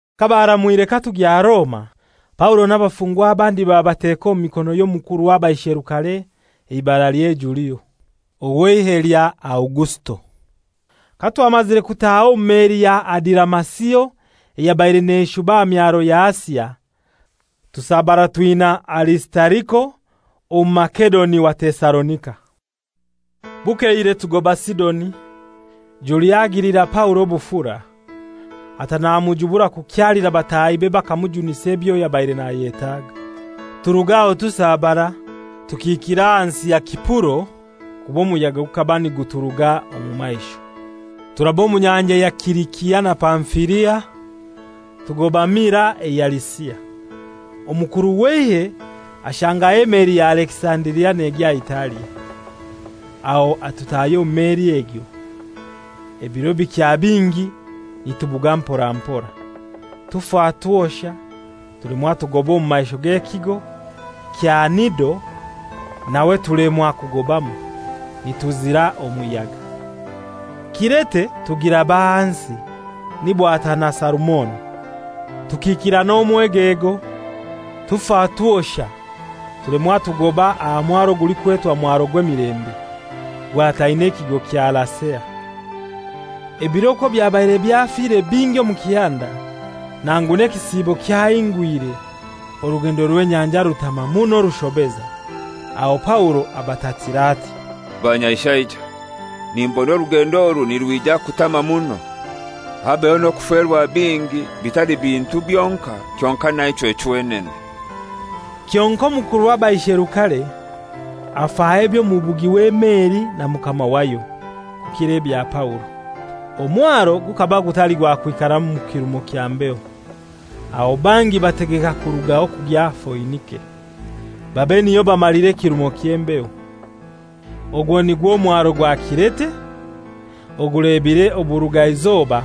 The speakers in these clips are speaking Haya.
Kabaramwire katugya Roma, Paulo n'abafungwa abandi babateka omu mikono y'omukuru w'abaisherukare eibaralye Julio, ow'eihe lya Augusito. Katwamazire kutaaha omu meli ya Adiramasio eyabaire neshuba aha myaro ya Asia, tusabara twina Arisitariko Omumasedoni wa Tesalonika. Bukeire tugoba Sidoni. Julio agilira Paulo obufura, ata namujubura kukyalira batahibe bakamujunisa ebyo yabaire nayetaaga. Turuga aho tusabara, tukiikira ahansi ya Sipuro, kuba omuyaga gukaba niguturuga omu maisho. Turaba omu nyanja ya Silisia na Pamfilia, tugoba Mira eya Lisia. Omukuru w'eihe ashangaho emeli ya Alekisandiria negya Italia. Aho atutahya omu meli egyo. Ebiro bikya bingi nitubuga mpora mpora, tufa twosha, tulemwa tugoba omu maisho g'ekigo kya Nido nawe tulemwa kugobamu, nituzira omuyaga. Kirete tugiraba ahansi, ni bwatana Salumone. Tukiikira n'omwegego, tufa twosha, tulemwa tugoba aha mwaro gulikwetwa Mwaro gw'Emilembe, gwataine ekigo kya Lasea. Ebiro okwo byabaire byafire bingi omu kihanda, nangu n'ekisiibo kyahingwire, orugendo rw'enyanja rutama muno rushobeza. Aho Paulo abatatira ati: «Banyaishaija, nimbona orugendo oru nirwija kutama muno, habeho n'okuferwa bingi, bitali bintu byonkai, kyonkai naichwe chwenene.» Kyonkai omukuru w'abaisherukare afaho eby'omubugi w'emeli na mukama wayo, kukira ebya Paulo. Omwaro gukaba gutali gwakwikaramu mu kirumo kya mbeho, aho bangi bategeka kurugaho kugya Foinike, babe niyo bamalira ekirumo ky'embeho. Ogwo nigwo mwaro gwa Kirete ogulebire oburugaizoba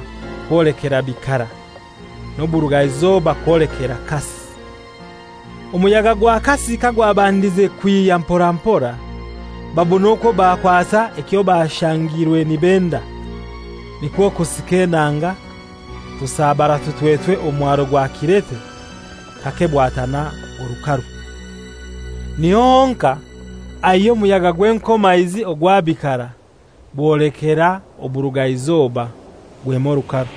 kwolekera bikara, n'oburugaizoba kwolekera kasi. Omuyaga gwa kasi kagwabandize kwihya mpora mpora, babona okwo bakwasa ekyo bashangirwe nibenda. Nikwo kusika enanga, tusabara tutwetwe omwaro gwa Kirete, kake bwatana orukaru. Niho honkai aihya omuyaga gw'enkomaizi ogwa bikara bwolekera oburugaizoba, gwema orukaru.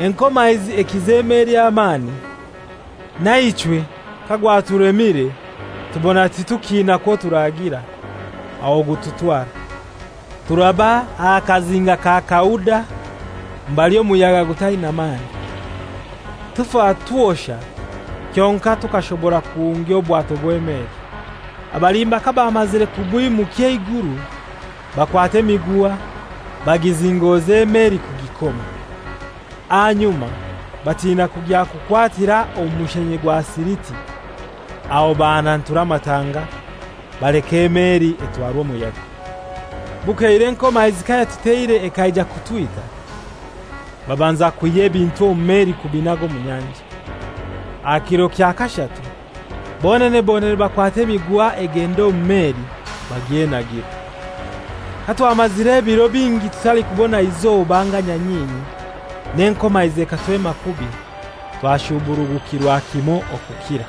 Enkomaizi ekiza emeli amani; naichwe kagwatulemire tubona titukina kwoturagira; aho gututwara. Turaba aha kazinga ka Kauda mbali omuyaga gutaina mani, tufa twosha kyonkai tukashobora kuhungya obwato bw'emeli. Abalimba kabamazire kubwimukya eiguru, bakwata emiguha bagizingoza emeli kugikoma. Ahanyuma batina kugya kukwatira omu mushenye gwa Siriti, aho bahanantura amatanga, baleka emeli etwarwa omuyaga. Bukeire enkomaizi kayatuteire ekaija kutwita, babanza kwihya ebintu omu meli kubinaga omu nyanja. Aha kiro kya kashatu bonene bonene bakwata emiguha egenda omu meli bagyenagira. Katwamazire ebiro bingi tutalikubona izoba anga nyanyinyi, n'enkomaizi ekatwema kubi, twashuburugukirwa kimoi okukira.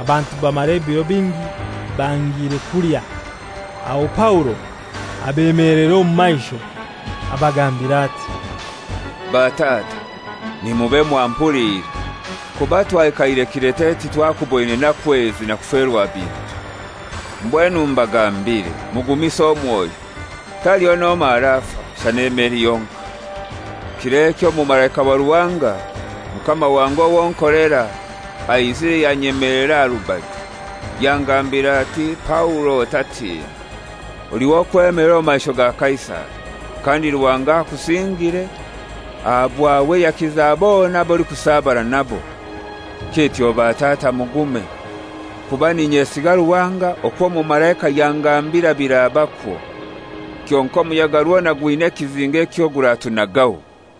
Abantu bamara ebiro bingi bangire kulya. Aho Paulo abemelera omu maisho abagambira ati, «Batata, nimube mwampuliire! Kuba twaikaire Kirete titwakuboine naku ezi na kuferwa bintu. Mbwenu mbagambire, mugumise omwoyo. Taliho n'omoi arafa, shana emeli yonkai. Kir'eki omumalaika wa Ruhanga, Mukama wange owo nkolera, aizire yanyemelera aha rubaju yangambira ati, ‹Paulo otatina. Oli w'okwemelera omu maisho ga Kaisari; kandi Ruhanga akusingire, aha bwawe yakiza bona ab'olikusabara nabo.› Kityo batata mugume, kuba n'inyesiga Ruhanga okw'omumalaika yangambira birabakwo. Kyonkai omuyaga rwona gwina ekizinga ekyo guratunagaho.»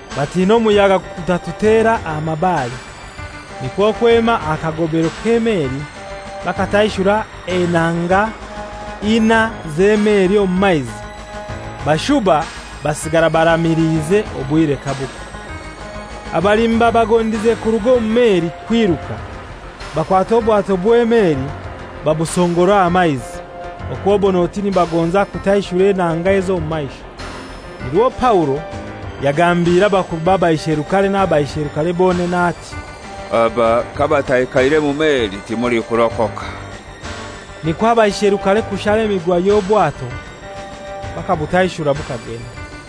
Batina omuyaga gutatutera aha mabare, nikwo kwema aha kagobero k'emeli bakataishura enanga inai z'emeli omu maizi, bashuba basigara baramiliize obwire kabukya. Abalimba bagondize kuruga omu meli kwiruka, bakwata obwato bw'emeli babusongora aha maizi, okwobon'oti nibagonza kutaishura enanga ez'omu maisho. Nirwo Paulo yagambire abakuru b'abaisherukare n'abaisherukare bonene ati, «Aba kabataikaire mu meli, timulikurokoka.» Nikwo abaisherukare kushara emiguha y'obwato bakabutaishura bukagenda.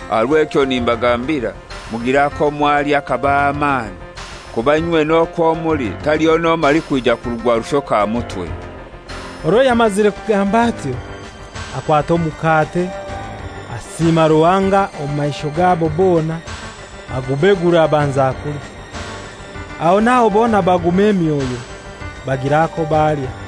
Aha rw'ekyo nimbagambira, mugire ako mwalya kabahe amani, kuba inywena okwo muli taliho n'omoi alikwija kurugwa rushoke aha mutwe.» Orwo yamazire kugamba atyo akwata omukate, asiima Ruhanga omu maisho gabo bona, agubegura abanza kulya. Aho n'aho bona baguma emyoyo, bagira ako balya.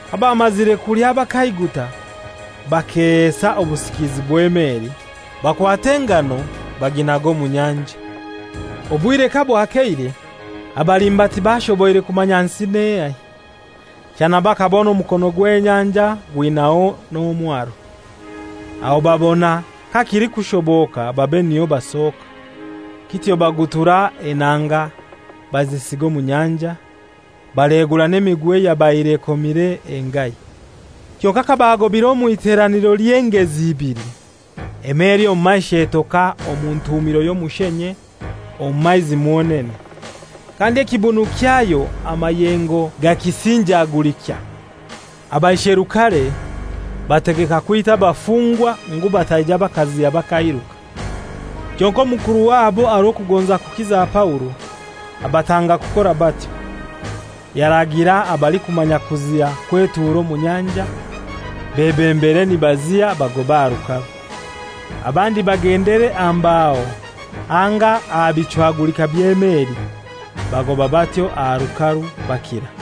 Kabamazire kulya bakaiguta, bakehesa obusikizi bw'emeli, bakwata engano baginaga omu nyanja. Obwire kabwakeire, abalimba tibashoboire kumanya nsi n'ehai, shana bakabona omukono gw'enyanja gwinaho n'omwaro, aho babona kakilikushoboka babe niho basoka. Kityo bagutura enanga bazisiga omu nyanja, baleegura n'emiguha eyabaire ekomire engahi. Kyonkai kabaagobaire omw'iteraniro ly'engezi ibili, emeli omu maisho etoka omu ntuumiro y'omushenye omu maizi mwonene. Kandi ekibunu kyayo amayengo gakisinjagulikya. Abaisherukare bategeka kwita abafungwa ngu bataija bakaziha bakairuka. Kyonkai omukuru wabo aha rw'okugonza kukiza Paulo, abatanga kukora batyo. Yaragira abalikumanya kuziha kwetuura omu nyanja, bebembere nibaziha bagobe aha rukaru; abandi bagendere aha mbaho anga aha bichwagulika by'emeli. Bagoba batyo aha rukaru, bakira.